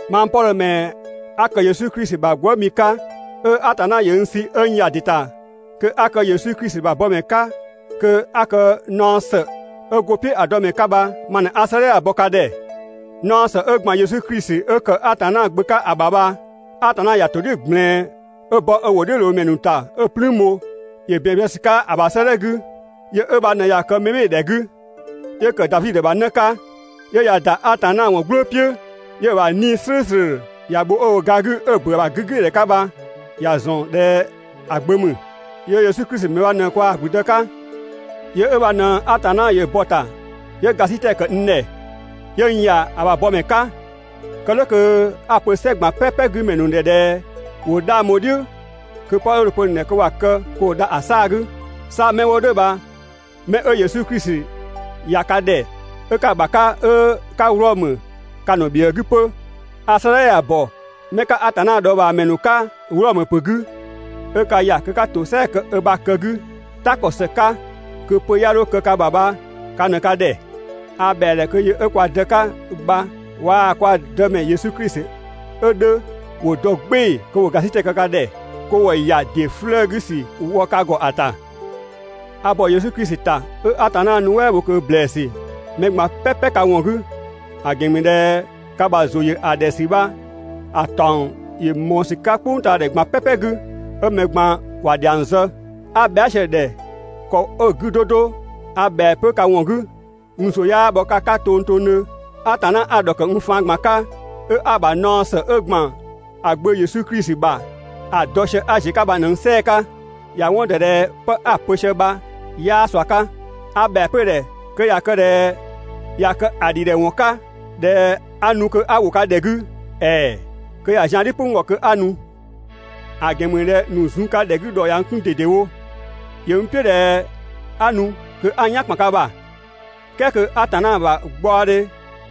Mang Pɔdhö ‑mɛ 'a ‑kë Yesu Klisi ‑bha gwëëmi 'ka, 'ö Atanna ‑yö n sü 'ö n ‑ya ‑dɩ ‑ta kö 'a kë Yesu Klisi ‑bha bɔmɛ 'ka kö 'a kë naɔ ‑së 'ö go‑ "piʋ̈ ‑a dɔmɛ 'ka bha ma ꞊në 'a 'sëëdhɛ ya‑ bɔ ka ‑dhɛ. Naɔ ‑së 'ö ‑gban Yesu Klisi 'ö ‑kë Atanna Gbö 'ka ‑a ‑bha bha, Atanna ‑ya ‑to "dhiʋ̈ ꞊gblɛɛn 'ö bɔ 'ö ‑wʋdhiʋ̈loomɛ ‑nu ‑ta 'ö‑ "plüün bho, ‑yö ‑bɛn zë ‑sü 'ka ‑a ‑bha 'sëëdhɛ 'gü. Yö 'ö bha ꞊në ꞊ya kë mɛbhɩɩdhɛ 'gü, 'yö ‑kë Davi ‑bha 'në 'ka, 'yö ꞊ya ‑da Atanna ‑wɔn "gblʋʋ "piʋ̈, 'yö‑ ‑bha 'Nii‑ "slʋ̈ʋ̈slʋ̈ ‑ya bho 'ö‑ wo ga 'gü 'ö‑ ‑bö ö ‑bha 'gügbɩɩdhɛ 'ka bha ‑ya ‑zɔn ꞊dhɛ ‑a Gbö ‑mü. Yöö Yesu Klisi ‑mɛ bha ꞊në kwaa‑ ‑gblüdë 'ka. Yö 'ö bha ꞊në Atanna ‑yö bɔ‑ ‑ta 'yö ‑gasitɛ ‑kë n ‑dhɛ, 'yö n ‑ya ‑a ‑bha bɔmɛ 'ka, kë "dhʋ̈ kö 'a‑ pö "sɛ ꞊gban "pɛpɛ 'gü ‑mɛ ‑nu ‑dhɛ ꞊dhɛ ‑wo 'dhang bho‑ "dhiʋ̈ kö 'pë 'ö dho‑ pö‑ ‑nu ‑dhɛ ‑wa kë kö ‑wo dha ‑a 'saa‑ 'gü. 'Sa 'mɛ 'wo "dhʋ̈ bha 'mɛ 'ö Yesu Klisi ꞊ya ka ‑dhɛ 'ö 'ka‑ ‑bha 'ka 'ö 'ka Wlɔmö ka‑ ‑nu ‑bhiëë 'gü 'pö. A 'sëëdhɛ ya‑ ‑bɔ 'mɛ 'ka Atanna dhɔɔbhaamɛ ‑nu 'ka Wlɔmö ‑pö 'gü, 'ö ka ‑ya kö 'ka ‑tosɛa kë ö ‑bha kë 'gü, "ta ‑kɔ ‑së 'ka kö pö 'ya 'dho kë ka ‑bha bha ka ꞊në ka ‑dhɛ. A ‑bhɛa ‑dhɛ kö yö 'ö kwa Dë 'ka bha waa‑ kwa Dëmɛ Yesu Klisi 'ö 'dhö ‑wo dɔ "gbɩɩ‑ kö ‑wo ‑gasitɛ kë ka ‑dhɛ, kö ‑wo ‑ya ‑dɩ 'flëë‑ 'gü ‑sü wɔ ka ‑gɔ ‑a ‑ta! A ‑bɔ Yesu Klisi ‑ta 'ö 'a Atanna nuɛ" bho ꞊kö ‑blɛɛsü mɛ ꞊gban "pɛpɛ ka ‑wɔn 'gü, ‑a ‑gɛn ‑mü ꞊dhɛ ka ‑bha ‑zʋ ‑yö ‑a ‑dhɛ ‑sü bha‑ ‑taɔng ‑yö ꞊mɔɔ ‑sü 'ka "kpʋngtaadhɛ ꞊gban "pɛpɛ 'gü, 'ö mɛ ꞊gban ‑wa ‑dhiang zë. 'A bhɛa" sië‑ ‑dhɛ ‑kɔ 'ö‑ 'gü 'do 'do, a ‑bhɛa 'pö ka ‑wɔn 'gü, n ‑zʋ 'yaa bhɔ ka 'ka tongtongdhö. Atanna 'a‑ ‑dhɔkë n faan ꞊gban 'ka, 'ö 'a‑ ‑bha naɔ ‑së 'ö ‑gban ‑a Gbö Yesu Klisi ‑bha ‑a dɔ sië 'a ‑ziö 'ka bha ꞊në n "sɛɛ‑ 'ka. ‑Ya 'wɔn ‑dɔ ꞊dhɛ 'pë 'a‑ pö sië bha 'yaa ꞊sua 'ka. A ‑bhɛa 'pö‑ ‑dhɛ kö ꞊ya kë ꞊dhɛ ꞊ya kë ‑a ‑dhidhɛwɔn 'ka ꞊dhɛ 'a nu kö 'a ‑wo ka ‑dhɛ 'gü, ‑ɛɛ! Kö ‑ya zian "dhi "pʋ n ‑gɔ kö 'a nu. ‑A ‑gɛn ‑mü ꞊dhɛ ‑nu zun ka ‑dhɛ 'gü ‑dhɔ ꞊ya n 'kun ꞊dedewo. ‑Yö n "piʋ̈ ꞊dhɛ 'a nu kö 'a n "yan ‑kpan ka ‑bha, "kɛɛ kö Atanna ‑bha gbaɔdhe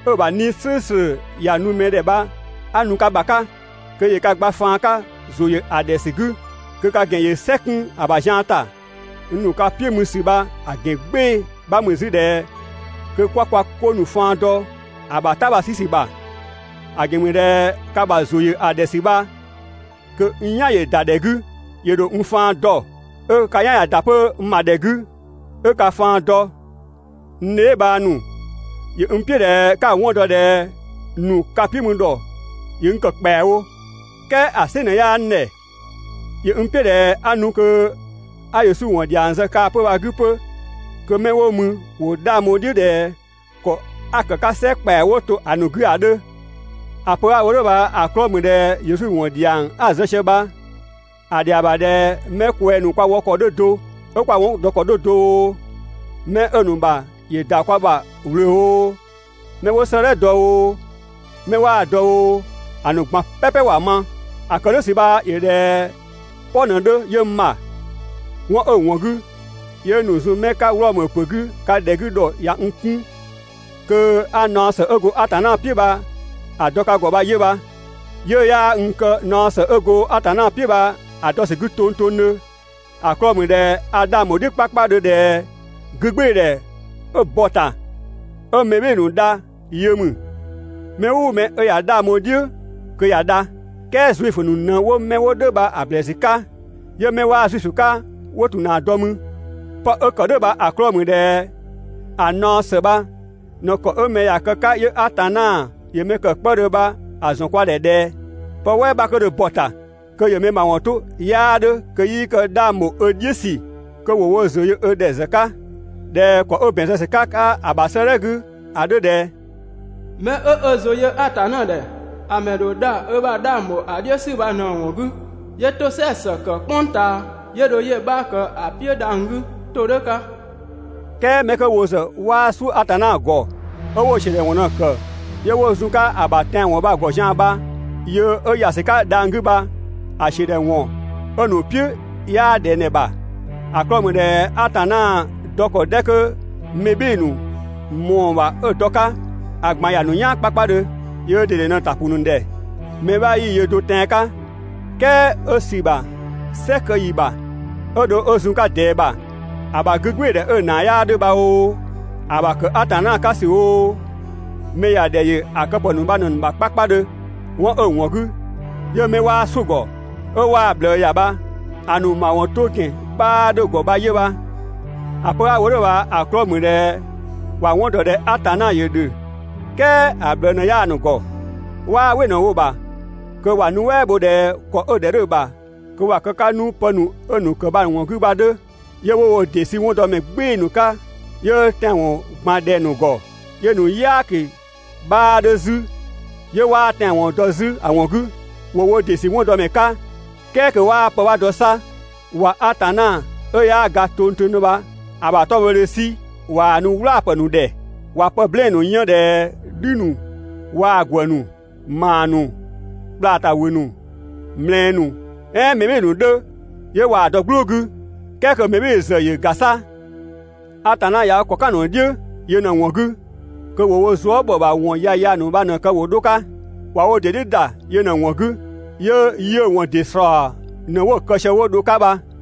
'ö‑ ‑bha 'Nii‑ "slʋ̈ʋ̈slʋ̈ ‑ya nu mɛ ‑dhɛ bha 'a nu ka ‑bha 'ka, kö ‑yö ka gba faan 'ka ‑zʋ ‑yö ‑a ‑dhɛ ‑sü 'gü, kö ka ‑gɛn ‑yö "sɛ 'kun ‑a ‑bha zian ‑ta. N ‑nu ka "piʋ̈ mü ‑sü bha‑ ‑gɛn "gbɩɩ‑ 'bha ‑mü 'zü ꞊dhɛ kö 'kwa kwa 'ko ‑nu faan dɔ‑ ‑bha "ta bha‑ 'sü ‑sü ‑bha. ‑A ‑gɛn ‑mü ꞊dhɛ ka ‑bha ‑zʋ ‑yö ‑a ‑dhɛ ‑sü bha kö n "yan ‑yö ‑da ‑dhɛ 'gü, ‑yö ‑dho n faan dɔ, 'ö ka "yan ꞊ya ‑da 'pö n ‑bha ‑dhɛ 'gü 'ö ka faan dɔ. N dheebhang ‑nu, ‑yö n "piʋ̈ ꞊dhɛ 'ka‑ 'wɔn dɔ ꞊dhɛ ‑nu ka "piʋ̈ mü ‑dhɔ ‑yö n ‑kë ‑kpɛawo, "kɛɛ ‑a "sɩ ꞊në 'yaa n ‑dhɛ. ‑Yö n "piʋ̈ ꞊dhɛ 'a nu kö 'a Yesu ‑wɔn ‑dhiang zë kaa‑ 'pö‑ bha‑ 'gü 'pö kö 'mɛ 'wo mü ‑wo 'dhang bho‑ "dhiʋ̈ ꞊dhɛ ‑kɔ 'a‑ ‑kë 'ka "sɛ ‑kpɛa 'wo to ‑a ‑nu 'gü ‑a 'dhö. ‑A pö 'a‑ wo "dhʋ̈ bha‑ 'klɔɔ‑ ‑mü ꞊dhɛ Yesu ‑wɔn ‑dhiang 'a‑ zë sië bha, ‑a ‑dhɛa ‑bha ꞊dhɛ 'mɛ kwɛng‑ ‑nu kwa wɔ ‑kɔ 'dhö do ('ö kwa 'wɔn dɔ ‑kɔ 'dhö do oo), 'mɛ 'ö‑ ‑nu ‑bha ‑yö ‑da kwa ‑bha ꞊wlöö oo, 'mɛ 'wo 'sëëdhɛ dɔ oo, 'mɛ 'waa‑ dɔ oo, ‑a ‑nu ꞊gban "pɛpɛ ‑wa ma. ‑A ‑kë "dhʋ̈ ‑sü bha ‑yö ꞊dhɛ "pɔ ꞊në 'dhö 'yö n ‑bha. 'Wɔn 'ö‑ ‑wɔn 'gü 'yö ‑nu zun 'mɛ 'ka Wlɔmö ‑pö 'gü ka ‑dhɛ 'gü ‑dhɔ ꞊ya n 'kun kö 'a naɔ ‑së 'ö go Atanna "piʋ̈ bha‑ dɔ ka ‑gɔ 'pö bha 'yö bha. 'Yiʋ̈‑ 'yaa n kë naɔ ‑së 'ö go Atanna "piʋ̈ bha‑ dɔ ‑sü 'gü tongtongdhö, ‑a 'klɔɔ‑ ‑mü ꞊dhɛ a 'dhang bho‑ "dhiʋ̈ 'kpakpadhö ꞊dhɛ 'gügbɩɩdhɛ 'ö bɔ‑ ‑ta 'ö mɛ "bhɩɩ‑ ‑nu dha yö ‑mü. Mɛ "ʋʋ mɛ 'ö ꞊ya 'dhang bho‑ "dhiʋ̈ kö ꞊ya dha. "Kɛɛ Zuifö ‑nu ꞊në 'wo 'mɛ 'wo "dhʋ̈ bha‑ ‑blɛɛsü 'ka, 'yö 'mɛ 'waa Zuifö 'ka 'wo ‑tun ‑na dɔ mü. 'Pë 'ö‑ ‑kë "dhʋ̈ bha‑ 'klɔɔ‑ ‑mü ꞊dhɛ ‑a naɔ ‑së bha ꞊në ‑kɔ 'ö mɛ ꞊ya kë‑ 'ka 'yö Atanna ‑yö mɛ ‑kë 'kpëdhö bha‑ ‑zɔn kwa ‑dhɛ ꞊dhɛ: Pë "wɛɛ 'bha 'kö dho bɔ‑ ‑ta kö ‑yö mɛ ‑mawɔn 'to 'yaa 'dhö kö 'yii kë 'dhang ‑bho ö "dhiʋ̈ ‑sü kö ‑wo wo ‑zʋ yö ö ‑dhɛ ‑zë 'ka, ꞊dhɛ ‑kɔ 'ö ‑bɛn zë ‑sü 'ka‑ 'ka ‑a ‑bha 'sëëdhɛ 'gü ‑a 'dhö ꞊dhɛ: «'Mɛ 'ö ö ‑zʋ yö Atanna ‑dhɛ, ‑a ‑mɛ ‑dho dha ö ‑bha 'dhang ‑bho ‑a "dhiʋ̈ ‑sü bha ꞊në‑ ‑wɔn 'gü, 'yö ‑tosɛa ‑së kë "kpʋng ꞊taa, 'yö dho 'yö‑ 'bha ‑kë ‑a "piʋ̈ dhang‑ 'gü ‑todhʋ̈ 'ka.» "Kɛɛ 'mɛ 'kö wo ‑zë 'waa "suʋ̈ Atanna ‑gɔ, 'ö 'wo‑ ‑siödhɛwɔn ꞊në‑ ‑kë 'yö 'wo zun‑ 'ka‑ ‑bha tɛanwɔn bha‑ ‑gɔ zian‑ bha, yö 'ö ‑ya ‑sü 'ka dhang‑ 'gü bha‑ ‑siö ‑dhɛ ‑wɔn 'ö‑ ‑nu "piʋ̈ 'yaa ꞊dhɛng ‑dhɛ ‑bha. ‑A 'klɔɔ‑ ‑mü ꞊dhɛ Atanna dɔ ‑kɔ 'dhɛ 'kö mɛ "bhɩɩ‑ ꞊mɔɔ‑ ‑bha 'ö‑ dɔ‑ 'ka, ‑a ꞊gban ‑ya ‑nu "yaan 'kpakpadhö. Yöö ꞊dede ꞊në‑ ‑ta ‑pʋ ‑nu ‑dhɛ. Mɛ 'bha 'yii‑ yö do tɛan‑ 'ka, "kɛɛ 'ö sü ‑bha "sɛ kë ‑yi ‑bha 'ö dho 'ö zun‑ 'ka ꞊dɛɛ ‑bha, ‑a ‑bha 'gügbɩɩdhɛ 'ö‑ ‑naa 'yaa 'dhö bha oo, ‑a ‑bha ‑kë Atanna 'ka ‑sü oo, mɛ ‑ya ‑dhɛ ‑yö ‑a kë ‑pë ‑nu bha ꞊në‑ ‑nu ‑bha 'kpakpadhö. 'Wɔn 'ö‑ ‑wɔn 'gü, 'yö 'mɛ 'waa "suʋ̈‑ ‑gɔ, 'ö 'waa‑ ꞊bhlëë ‑ya bha, ‑a ‑nu ‑mawɔn 'to ‑gɛn 'bhaa 'dhö‑ ‑gɔ bha 'yö bha. ‑A pö 'a‑ wo "dhʋ̈ bha‑ 'klɔɔ‑ ‑mü ꞊dhɛ ‑wa 'wɔn ‑dɔ ꞊dhɛ Atanna ‑yö ‑dhö, "kɛɛ ‑a ꞊bhlëë ꞊në 'yaa‑ ‑nu ‑gɔ, 'waa "wɩ ꞊në‑ wo‑ ‑bha kö ‑wa nuɛ" bho ꞊dhɛ ‑kɔ 'ö‑ ‑dhɛ 'dhö‑ ‑bha kö ‑wa kë‑ 'ka 'nu pë ‑nu 'ö‑ ‑kë bha‑ ‑wɔn 'gü bha‑ 'dhö, 'yö 'wo wo ‑dɩ sü 'wɔndɔmɛ "gbɩɩ‑ ꞊në‑ 'ka, 'yö tɛanwɔn ꞊gbaan ꞊dhɛng‑ ‑nu ‑gɔ, 'yö‑ ‑nu "yaaki 'bhaa 'dhö 'zü, 'yö 'waa tɛanwɔn dɔ 'zü ‑a ‑wɔn 'gü. ‑Wo wo ‑dɩ ‑sü 'wɔndɔmɛ 'ka, "kɛɛ kö 'waa pë 'bha dɔ 'sa. ꞊Wa Atanna 'ö 'yaa ga tongtongdhö bha‑ ‑bha 'tɔbhɔdhe 'sü ꞊waa‑ ‑nu "wlaapë ‑nu ‑dhɛ. ꞊Wa pë "blɛɛn‑ ‑nu 'yën ꞊dhɛ "dhü ‑nu waa‑ ‑gwë ‑nu, ‑maa ‑nu, ꞊kwlaa ‑ta ‑wü ‑nu, ꞊mlɛɛ ‑nu "ɛɛn mɛ "bhɩɩ‑ ‑nu 'dhö, 'yö ꞊waa‑ dɔ‑ "gblʋʋ 'gü, "kɛɛ kö mɛ "bhɩɩ‑ ‑zë ‑yö ‑ga 'sa. Atanna ꞊ya ö ‑kɔ "kan‑ ‑nu "dhiʋ̈ yö ꞊në‑ ‑wɔn 'gü kö ‑wo wo zuë" ‑bhɔ ‑bha ‑wɔn yaya ‑nu ‑bha ꞊në‑ kë wo 'dho‑ 'ka. ꞊Wa wo ‑dɩ "dhiʋ̈ ‑da yö ꞊në‑ ‑wɔn 'gü, 'yö 'yiʋ̈‑ ‑wɔn ‑dɩ ‑slɔɔ ꞊në 'wo‑ kë sië 'wo dho‑ 'ka ‑bha.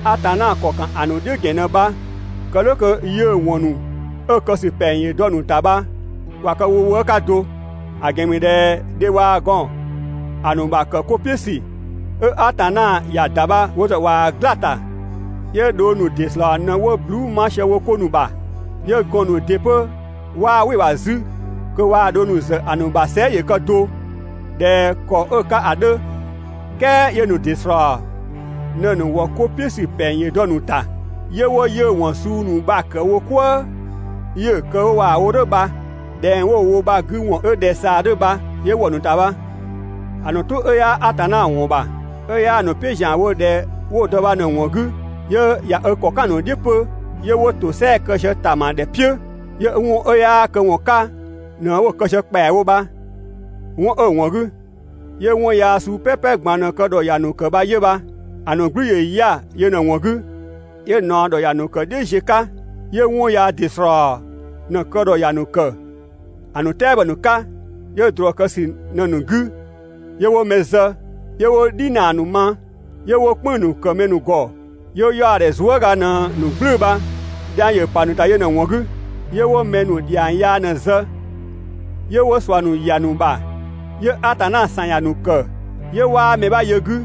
Atanna ‑kɔ ‑kan ‑a ‑nu "dhiʋ̈ ‑gɛn ꞊në bha, kë "dhʋ̈ kö 'yiʋ̈‑ ‑wɔn ‑nu 'ö‑ kë ‑sü ‑pɛng ‑yö dɔ‑ ‑nu ‑ta bha ‑wa kë wo wëë' 'ka do. ‑A ‑gɛn ‑mü ꞊dhɛ dhe waa‑ gɔn ‑a ‑nu ‑bha ‑kë 'ko "piʋ̈ ‑sü 'ö Atanna ‑ya ‑da bha wo ‑zë ꞊waa‑ "gla‑ ‑ta, 'yö dhong ‑nu ‑dɩ ‑slɔɔ ꞊në 'wo bhluu" 'ma sië wo 'ko ‑nu bha, 'yö gɔɔn‑ ‑nu ‑dɩ 'pö 'waa "wɩ‑ ‑bha 'zü kö waa‑ dhong ‑nu ‑zë ‑a ‑nu ‑bha sɛɛ" ‑yö kë do ꞊dhɛ ‑kɔ 'ö‑ 'ka ‑a 'dhö, "kɛɛ 'yö‑ ‑nu ‑dɩ ‑slɔɔ ꞊në‑ ‑nu ‑wɔ 'ko "piʋ̈ ‑sü ‑pɛng ‑yö dɔ‑ ‑nu ‑ta, 'yö 'wo 'yiʋ̈‑ ‑wɔn suu ‑nu bha‑ ‑kë wo "kwëë, 'yö‑ kë 'ö ꞊waa‑ wo "dhʋ̈ bha, ꞊dhɛng 'wo‑ wo bha‑ 'gü ‑wɔn 'ö ꞊dhɛ‑ ꞊saa 'dhö bha 'yö ‑wɔ ‑nu ‑ta bha. ‑A ‑nu "tʋ 'ö 'yaa Atanna ‑wɔn ‑bha, 'ö 'yaa‑ ‑nu "piʋ̈ ‑zianwo ꞊dhɛ 'wo‑ dɔ bha ꞊në‑ ‑wɔn 'gü, 'yö ꞊ya ö ‑kɔ "kan‑ ‑nu "dhiʋ̈ 'pö, 'yö 'wo ‑tosɛa kë sië ‑tama ‑dhɛ "piʋ̈, 'yö 'wɔn 'ö 'yaa këwɔn 'ka ꞊në 'wo‑ kë sië ‑kpɛawo bha. 'Wɔn 'ö‑ ‑wɔn 'gü, 'yö 'wɔn yaa suu "pɛpɛ ꞊gban ꞊në‑ kë ‑dhɔ ‑ya ‑nu ‑kë bha 'yö bha. ‑A ‑nu "gblü ‑yö 'ya‑ yö ꞊në‑ ‑wɔn 'gü, 'yö ꞊naɔ ‑dhɔ ‑ya ‑nu ‑kë "dhiʋ̈ ziö 'ka, 'yö 'wɔn yaa ‑dɩ ‑slɔɔ ꞊në‑ kë ‑dhɔ ‑ya ‑nu ‑kë ‑a ‑nu "tɛabɔ ‑nu 'ka, 'yö ꞊drɔ kë ‑sü ꞊në‑ ‑nu 'gü, 'yö 'wo mɛ zë, 'yö 'wo "dhi ‑naa ‑nu ma, 'yö 'wo "kpënng‑ ‑nu ‑kë mɛ ‑nu ‑gɔ, 'yö 'yaɔdhɛ zuëga ꞊në‑ ‑nu "gblʋ̈ʋ̈‑ bha. Dhiang ‑yö ‑pa ‑nu ‑ta yö ꞊në‑ ‑wɔn 'gü, 'yö 'wo mɛ ‑nu ‑dhiang yaa ꞊në‑ zë, 'yö 'wo ꞊sua ‑nu ‑ya ‑a ‑nu ‑bha, 'yö Atanna ‑san ‑ya ‑nu ‑kë, 'yö 'waa mɛ 'bha yö‑ 'gü,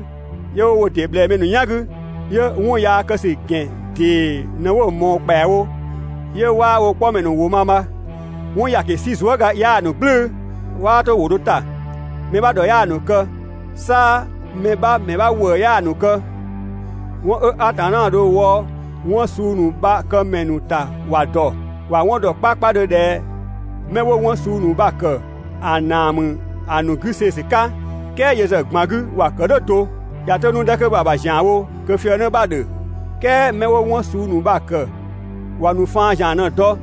'yö 'wo wo ‑dɩ ꞊bhlɛɛ mɛ ‑nu "yan 'gü, 'yö 'wɔn yaa kë ‑sü ‑gɛn ‑dee ꞊në 'wo‑ ꞊mɔɔ ‑kpɛawo, 'yö 'waa wo 'kpɔmɛ ‑nu ‑wʋ ma bha. 'Wɔn ‑yaki 'si zuëga 'yaa‑ ‑nu "gblʋ̈ʋ̈‑, 'waa 'to ‑wʋ do ‑ta, mɛ 'bha ‑dhɔ 'yaa‑ ‑nu kë, 'sa mɛ 'bha ‑mɛ 'bha ‑wëë 'yaa‑ ‑nu kë. 'Wɔn 'ö Atanna dho‑ wɔ 'wɔn suu ‑nu bha‑ këmɛ ‑nu ‑ta ‑wa ‑dɔ, ‑wa 'wɔn ‑dɔ 'kpakpadhö ꞊dhɛ 'mɛ 'wo 'wɔn suu ‑nu bha‑ ‑kë, ‑a ‑naa ‑mü ‑a ‑nu 'gü see‑ ‑sü 'ka, "kɛɛ yö ‑zë ꞊gban 'gü ‑wa ‑kë "dhʋ̈ do. ꞊Ya 'to 'nu‑ 'dhɛ 'kö bha‑ ‑bha ‑zianwo kö‑ fië 'në 'bha‑ ‑dhö, "kɛɛ mɛ 'wo 'wɔn suu ‑nu bha‑ ‑kë ‑wa ‑nu faan ‑zian ꞊në‑ dɔ.